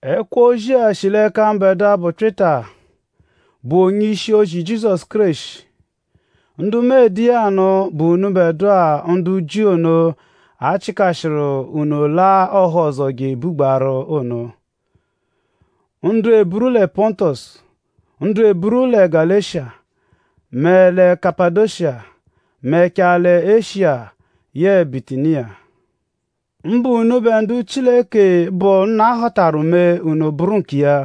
Ẹkwo-ozi-a shi l'ẹka mbẹdua, bụ Pyịta, bụ onye-ishi-ozi Jizọsu Kéreshi. Ndu mu ede iya anụ bụ unubẹ ndu Jiu ono, a chịkashiru unu laa ọhozo je ebugbaaru ono. Ndu eburu lẹ Pọntosu; ndu eburu lẹ Galeshiya mẹ lẹ Kapadosiya; mẹchaa lẹ Eshiya yẹe Bitiniya. Mbụ unubẹ ndu Chileke, bụ Nna họtaru mee; unu bụru nkiya.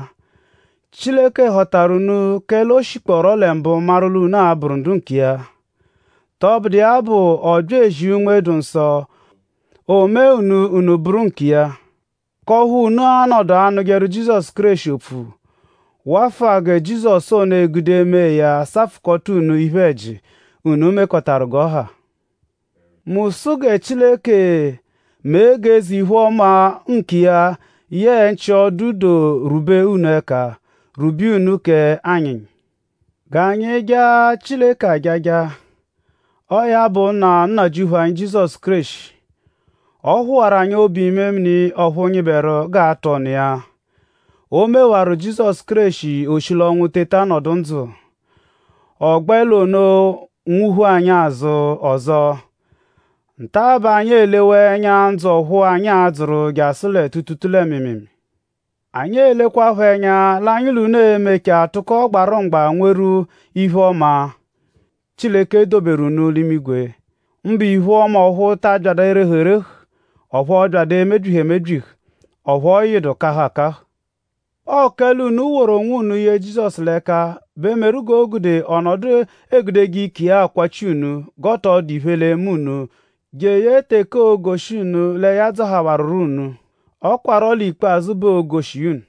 Chileke họtaru unu; kẹle o shikpọoro lẹ mbụ maru l'unu l'a-bụru ndu nkiya. Tọbudu iya bụ; ọ bya ezia Unme-dụ-Nsọ; o mee unu: unu bụru nkiya; k'ọphu unu a-nọdu anụjeru Jizọsu Kéreshi opfu; wafụa gẹ Jizọsu ono egude mee ya safụkota unu iphe-ẹji, unu mekọtaru g'ọ ha. Mu sụ gẹ Chileke mee g'eze-iphe-ọma nkiya yẹe nchị-ọdu-doo rwube unu ẹka; rwube iya unu k'anyịnyi. G'anyi jaa Chileke ajaja. Ọo ya bụ Nna Nnajịuphu anyi Jizọsu Kéreshi. Ọ phụwaru anyi obu-imemini ọphu nyịberu g'aa-tụ ọnu iya. O mewaru Jizọsu Kéreshi: o shi l'ọnwu teta nọdu ndzụ. Ọ gbẹ l'ono nwụ-phu anyi azụ ọzo. Nta-a bẹ anyi elewaa ẹnya ndzụ ọphu anyi a-dzụru jasụ lẹ tuutuutuu lẹ mịimiimii. Anyi elekwaphọ ẹnya l'anyi l'unu e-mechaa tụko gbarụ mgba nweru iphe-ọma, Chileke doberu unu l'imigwe; mbụ iphe-ọma ọphu ta abyadụ erehu erehu; ọphu ọ byadu emebyihu emebyihu; ọphu ọ yịdu kahụ akahụ. Ọo kẹle ọo l'unu woru onwunu ye Jizọsu l'ẹka bẹ meru g'o gude ọ nọdu egudeje ike iya akwachi unu g'ọ tọ dụ iphe l'e-me unu jeye teke oo-goshi unu lẹ ya dzọhawaruro unu. Ọ kwarọ l'ikpazụ bẹ oo-goshi iya unu.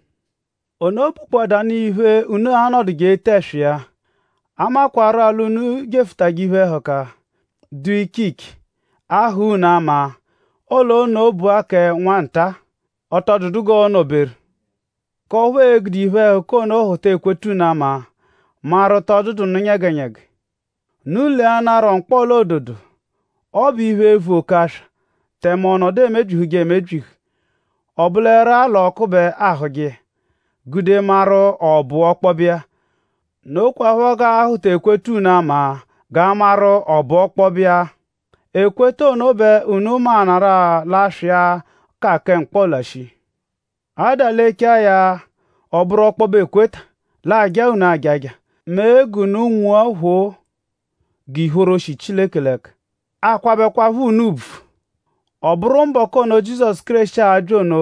Ono bụkpoadanu iphe unu a-nọduje ete ẹswa iya; a makwarụ-a l'unu jefụtaje iphe-ẹhuka, dụ iche iche, a-hụ unu ama; ọle ono bụ-a kẹ nwa nta-a; ọ tọ dụdu g'ọo-nọ-beru; k'ọphu e-gude iphe-ẹhuka ono hụta ekweta unu ama maru?tọ dụdu nụ nyẹgenyege. Unu leanarọ mkpọla-ododo. Ọ bụ iphe, vu oke aswa tẹme ọ nọdu emebyihujekwanu emebyihu. Ọ bụleru-a l'ọku bẹ aahụje iya gude maru?ọ bụ ọkpobe iya. Nokwaphọ g'aahụta ekweta unu ama g'a maru?ọ bụ ọkpobe iya. Ekweta ono bẹ unu maanarụ-a l'aswa iya ka kẹ mkpọla shii. A -dalechaa ya; ọ -bụru ọkpobe ekweta; l'aa-jaa unu ajaja; mee g'unu nwua phoo g'ìphóró, shi Chileke l'ẹka; aakwabẹkwapho unu ùbvù. Ọ bụru mbọku ono, Jizọsu Kéreshi a-bya ono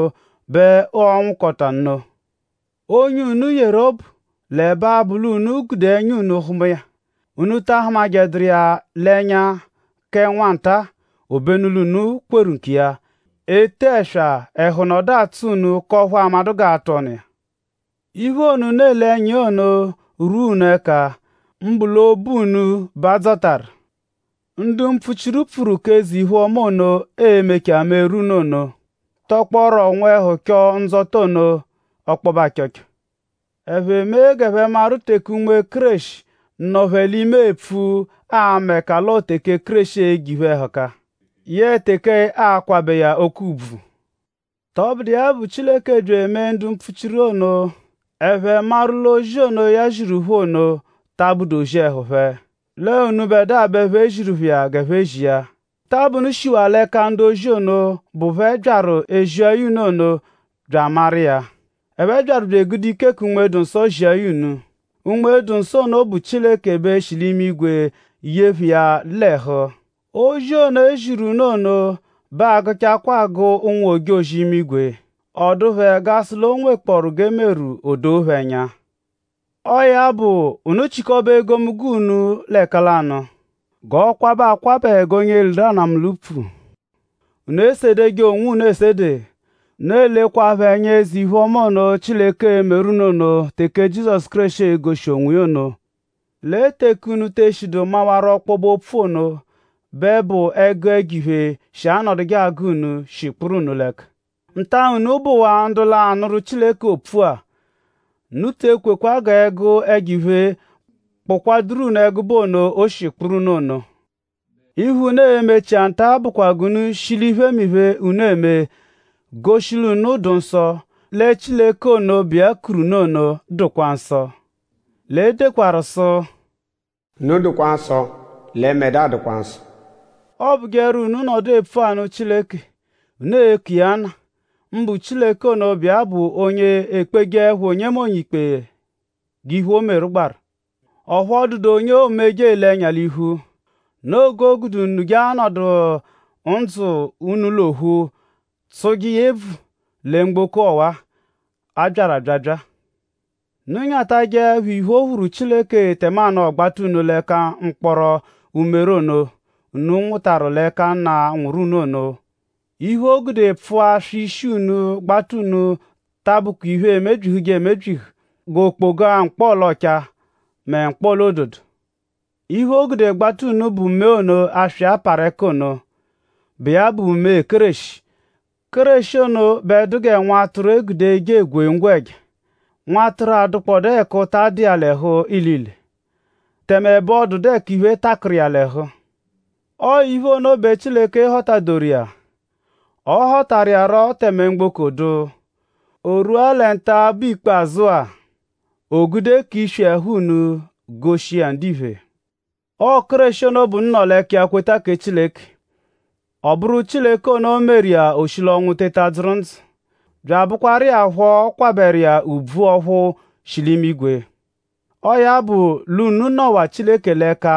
bẹ ọo-nwụkota nno. Onye unu yeru obu; l'ẹbe abụ l'unu gude ẹnya hụma iya; unu ta ahụmaduru iya l'ẹnya kẹ nwanta-a; obenu l'unu kweru nkiya; ete ẹswa; ẹhu nọdu atsọ unu k'ọphu aamadụ g'a-tụ ọnu iya. Iphe ono, unu ele ẹnya iya ono, rwua unu ẹka; mbụ l'obu unu bẹ a dzọtaru. Ndu mpfuchiru, pfuru k'eze-iphe-ọma ono, ee-mechaa meru unu ono; tọkpooru nwẹhu chọo ndzọta ono ọkpobe achọcho. Ẹphe mee g'ẹphe maru teke Unme Kéreshi, nọ phẹ l'ime epfu ama ẹka l'ọo teke Kéreshi e-je iphe-ẹhuka; yẹe teke a-kwabẹ iya oke ùbvù. Tọbudu iya bụ; Chileke bya emee ndu mpfuchiru iya ono, ẹphe maru l'ozi ono, ya ziru phẹ ono ta abụdu ozi ẹhu phẹ; l'ọo unubẹdua bẹ e ziru phẹ iya g'ẹphe bya ezia. Nta-a bẹ unu shiwaa l'ẹka ndu-ozi ono, bụ phẹ byaru ezia ya unu ono bya amaru iya. Ẹphe byaru bya egude ike kẹ Unme-dụ-Nsọ zia ya unu. Unme-dụ-Nsọ ono bụ Chileke bẹ shi l'imigwe ye phẹ iya l'ẹhu. Ozi ono, e ziru unu ono bẹ agụchakwaa agụ ụnwu-ojozi-imigwe. Ọ dụ phẹ g'a sụ l'o nwekpọoru g'e meru: o doo phẹ ẹnya. Ọo ya bụ; unu chịkobe egomunggo unu l'ẹkalanu; g'ọ kwabẹ akwabẹ g'onye liru anamụ l'upfu; unu esedeje onwunu esede; unu elekwaphọ ẹnya eze-iphe-ọma ono; Chileke e-meru unu teke Jizọsu Kéreshi e-goshi onwiya ono. Lẹ teke unu te eshidu mawaru ọkpobe-opfu ono bẹ bụ ẹgu ẹjo-iphe, shi anọduje agụ unu shi kpụru unu l'ẹka. Nta-a, unu bụwaa ndu l'anụru Chileke opfu-a unu te ekweẹkwa g'ẹgu ẹjo-iphe kpụkwaduru unu ẹgube ono, o shi kpụru unu ono. Iphe, unu e-mechia nta-a bụkwa g'unu shi l'iphemiphe, unu eme goshi l'unu dụ nsọ; lẹ Chileke ono, bụ iya kuru unu ono bẹ dụkwa nsọ. L'e dekwaru sụ: “Unu dụkwa nsọ; lẹ mbẹdua dụkwa nsọ.” Ọobujeru; unu -nọdu epfu anụ Chileke; unu eku iya Nna; mbụ Chileke ono, bụ iya bụ onye ekpejeẹpho onyenọnu ikpe g'iphe, o meru gbaru; ọphu ọ dụdu onye oomeje ele ẹnya l'iphu. Noo g'o gude unu je anọdu ndzụ unu l'ophu; tsụje iya ebvu lẹ mgboko ọwa-a, a byaru abyabya-a. Unu nyatajẹkwa iphe, o phuru Chileke tẹmanu ọ gbata unu l'ẹka mkpọkoro umere ono, unu nwụtaru l'ẹka nna, nwụru unu phẹ ono. Iphe, o gude pfụa aswa ishi unu gbata unu ta abụkwa iphe emebyihuje emebyihu g'okpoga-mkpọla-ọchaa mẹ mkpọla-ododo. Iphe, o gude gbata unu bụ mee ono, aswa iya parụ ẹka ono, bụ iya bụ mee Kéreshi. Kéreshi ono bẹ dụ gẹ nwatụru, e gude eje egwe ngwẹja; nwatụru, adụkpodaa ẹka ụta dụ iya l'ẹhu ilile; tẹme ẹbe ọ dụdu ẹka iphe, takụru iya l'ẹhu. Ọo iphe ono bẹ Chileke họta-doru iya. Ọ họtaru iya rọ tẹme mgboko dụ; o rwua lẹ nta-a, bụ ikpazụ-a; o gude k'iswi ẹhu unu goshi iya ndiphe. Ọo Kéreshi ono bẹ unu nọ l'ẹka iya kweta kẹ Chileke; ọ bụru Chileke ono meru iya o shi l'ọnwu teta dzụru ndzụ; bya abụkwaru iya phọ kwabẹru iya ùbvù ọphu shi l'imigwe. Ọo ya bụ; l'unu nọwa Chileke l'ẹka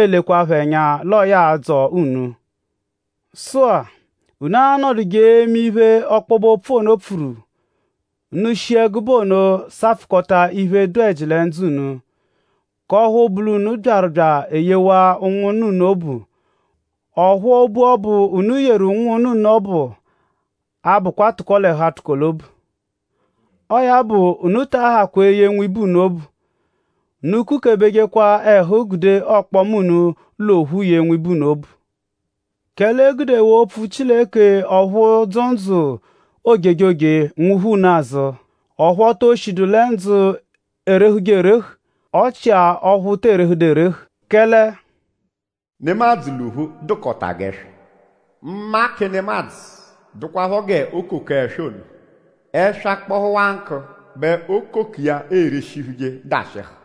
elekwaphọ ẹnya l'ọo ya l'a-dzọ unu. Sụ-a; unu anọduje eme iphe, ọkpobe-opfu ono pfuru. Unu shi ẹgube ono safụkota iphe, dụ ẹji lẹ ndzụ unu; k'ọphu bụ l'unu byaru bya eyewa ụnwunna unu obu; ọphu obu ọbu, unu yeru ụnwunna unu ọbu abụkwa tụko-l'ẹhu-atụko-l'obu. Ọo ya bụ; unu ta ahakwa eye nwibe unu obu. Unu kukebejekwa ẹhu gude ọkpoma unu l'ophu yee nwibe unu obu. Kẹle e gudewaa opfu Chileke ọphu dzụ ndzụ ojejoje nwuphu unu azụ; ọphu o to shidu lẹ ndzụ erehuje erehu; ọ chia ọphu tee rehedu erehu. Kẹle “Nemadzụ l'ophu dụkota g'ẹswa. Mma kẹ nemadzụ dụkwapho g'okoko ẹswa ono. Ẹswa -kpọhuwaa nkụ bẹ okoko iya erishihuje dashịhu.